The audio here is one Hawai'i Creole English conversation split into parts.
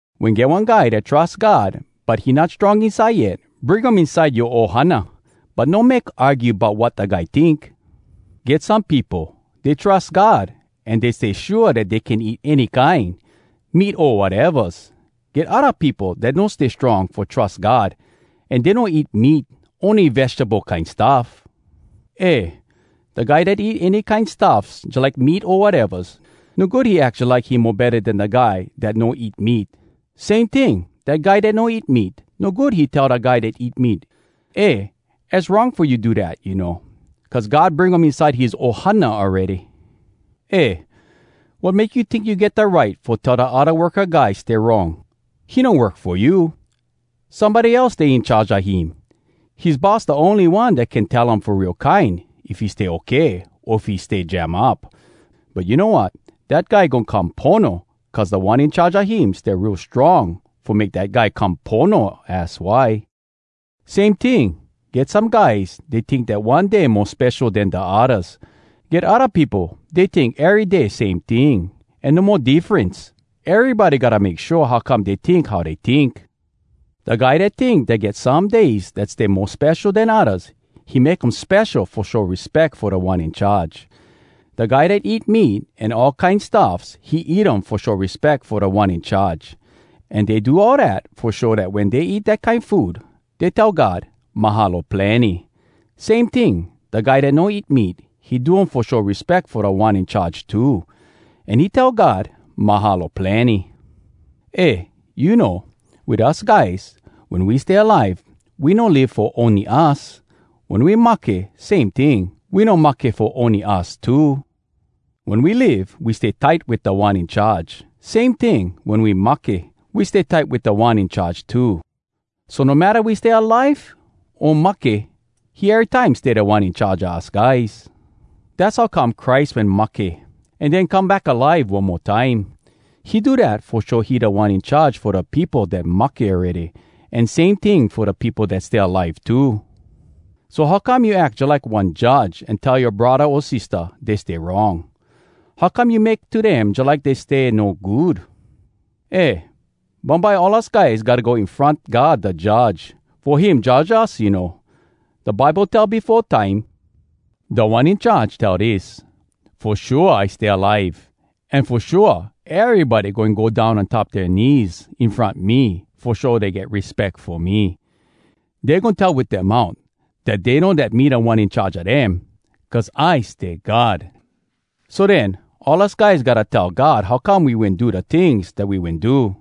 Wen get one guy dat trus God but he not strong inside yet, bring um inside yoa ohana. But no make argue bout wat da guy tink. Get some peopo, dey trus God, an dey stay shua dat dey can eat any kine, meat o watevas. Get odda peopo dat no stay strong fo trus God, an dey no eat meat, ony vegable kine stuff. Eh! da guy dat eat any kine stuffs jalike meat o watevas, no good he ack jalike he mo betta den da guy dat no eat meat. Same ting, dat guy dat no eat meat, no good he tell da guy dat eat meat, “Eh, az wrong fo you do dat, you know.” Cuz God bring um inside his ohana awready! Eh, wat make you tink you get da right fo tell dat da odda worka guy stay wrong? He no work fo you! Somebody else stay in charge a him. His boss da ony one dat can tell um fo real kine if he stay okay o if he stay jam up. But you know wat? Dat guy goin come pono, cuz Da One In Charge a him stay real strong fo make dat guy come pono, az why. Same ting, get some guys, dey tink dat one day mo spesho den da oddas. Get odda peopo, dey tink ery day same ting, an no mo diffrence. Erybody gotta make shua how come dey tink how dey tink. Da guy dat tink dat get some days dat stay mo spesho den oddas, he make um spesho fo show respeck fo Da One In Charge. Da guy dat eat meat an all kine stuffs, he eat um fo show respeck fo Da One In Charge. An dey do all dat fo show dat wen dey eat dat kine food dey tell God, “Mahalo plenny!” Same ting, da guy dat no eat meat, he do um fo show respeck fo Da One In Charge too, an he tell God, “Mahalo plenny!” Eh, you know, wit us guys, wen we stay alive, we no live fo ony us. Wen we mahke, same ting, we no mahke fo ony us too. Wen we live, we stay tight wit Da One In Charge. Same ting, wen we mahke, we stay tight wit Da One In Charge too. So no matta we stay alive o mahke, he erytime stay Da One In Charge a us guys. Dass how come Christ wen mahke, an den come back alive one mo time. He do dat fo show he Da One In Charge fo da peopo dat mahke awready, an same ting fo da peopo dat stay alive too. So, how come you ack jalike one judge an tell yoa braddah o sistah dey stay wrong? How come you make to dem jalike dey stay no good? Eh, bumbye all us guys gotta go in front God da Judge, fo him judge us, you know. Da Bible tell befo time, “Da One In Charge tell dis: ‘Fo shua I stay alive. An fo shua, Erybody goin go down on top dea knees in front me Fo show dey get respeck fo me. Dey goin tell wit dea mout Dat dey know dat me Da One In Charge a dem Cuz I stay God.’” So den, all us guys gotta tell God how come we wen do da tings dat we wen do.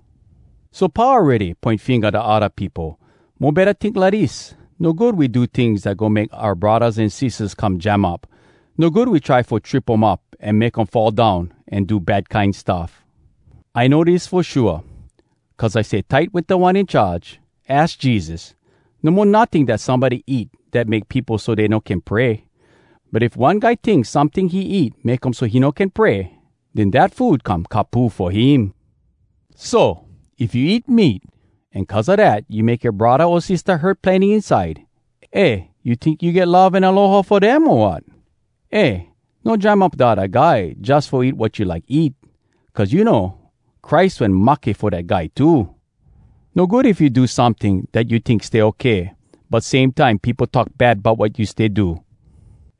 So pau awready poin finga da odda peopo. Mo betta tink lidis: no good we do tings dat goin make oua braddahs an sistahs come jam up. No good we try fo trip um up an make um fall down an do bad kine stuff. I know dis fo shua, cuz I stay tight wit Da One In Charge, az Jesus: No mo notting dat somebody eat dat make peopo so dey no can pray. But if one guy tink someting he eat make um so he no can pray, den dat food come kapu fo him. So if you eat meat, an cuz a dat, you make yoa braddah o sistah hurt plenny inside, eh, you tink you get love an aloha fo dem, o wat? Eh! No jam up da odda guy jus fo eat wat you like eat. Cuz you know, Christ wen mahke fo dat guy too! No good if you do someting dat you tink stay okay, but same time peopo talk bad bout wat you stay do.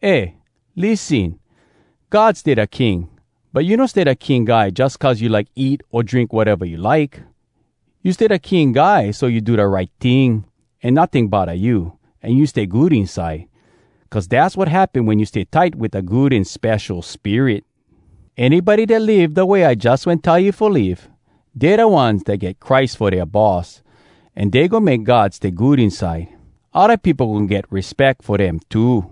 Eh lissen! God stay da King, but you no stay da king guy jus cuz you like eat o drink wateva you like. You stay da king guy, so you do da right ting, an notting bodda you, an you stay good inside. Cuz dass wat happen wen you stay tight wit da Good An Spesho Spirit. Anybody dat live da way I jus wen tell you fo live, dey da ones dat get Christ fo dea boss, an dey goin make God stay good inside. Odda peopo goin get respeck fo dem too.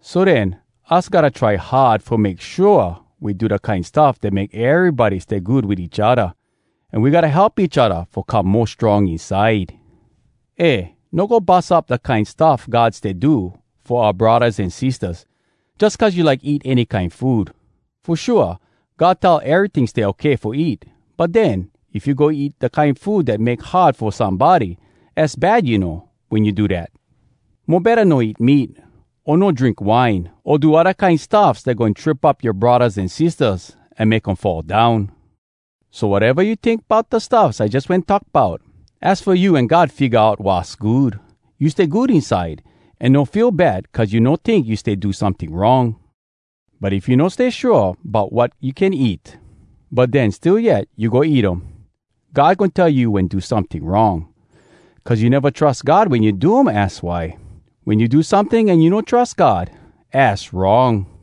So den, us gotta try hard fo make shua we do da kine stuff dat make erybody stay good wit each odda, an we gotta help each odda fo come mo strong inside. Eh, no go bus up da kine stuff God stay do fo oua braddahs an sistahs, jus cuz you like eat any kine food. Fo shua, God tell eryting stay okay fo eat, but den, if you go eat da kine food dat make hard fo somebody, az bad, you know, wen you do dat. Mo betta no eat meat, o no drink wine, o do odda kine stuffs dat goin trip up yoa braddahs an sistahs an make um fall down. So wateva you tink bout da stuffs I jus wen talk bout, az fo you an God figga out wass good. You stay good inside, an no feel bad cuz you no tink you stay do someting wrong. But if you no stay shua bout wat you can eat, but den still yet you go eat um, God goin tell you wen do someting wrong. Cuz you neva trus God wen you do um, az why. Wen you do someting an you no trus God, az wrong.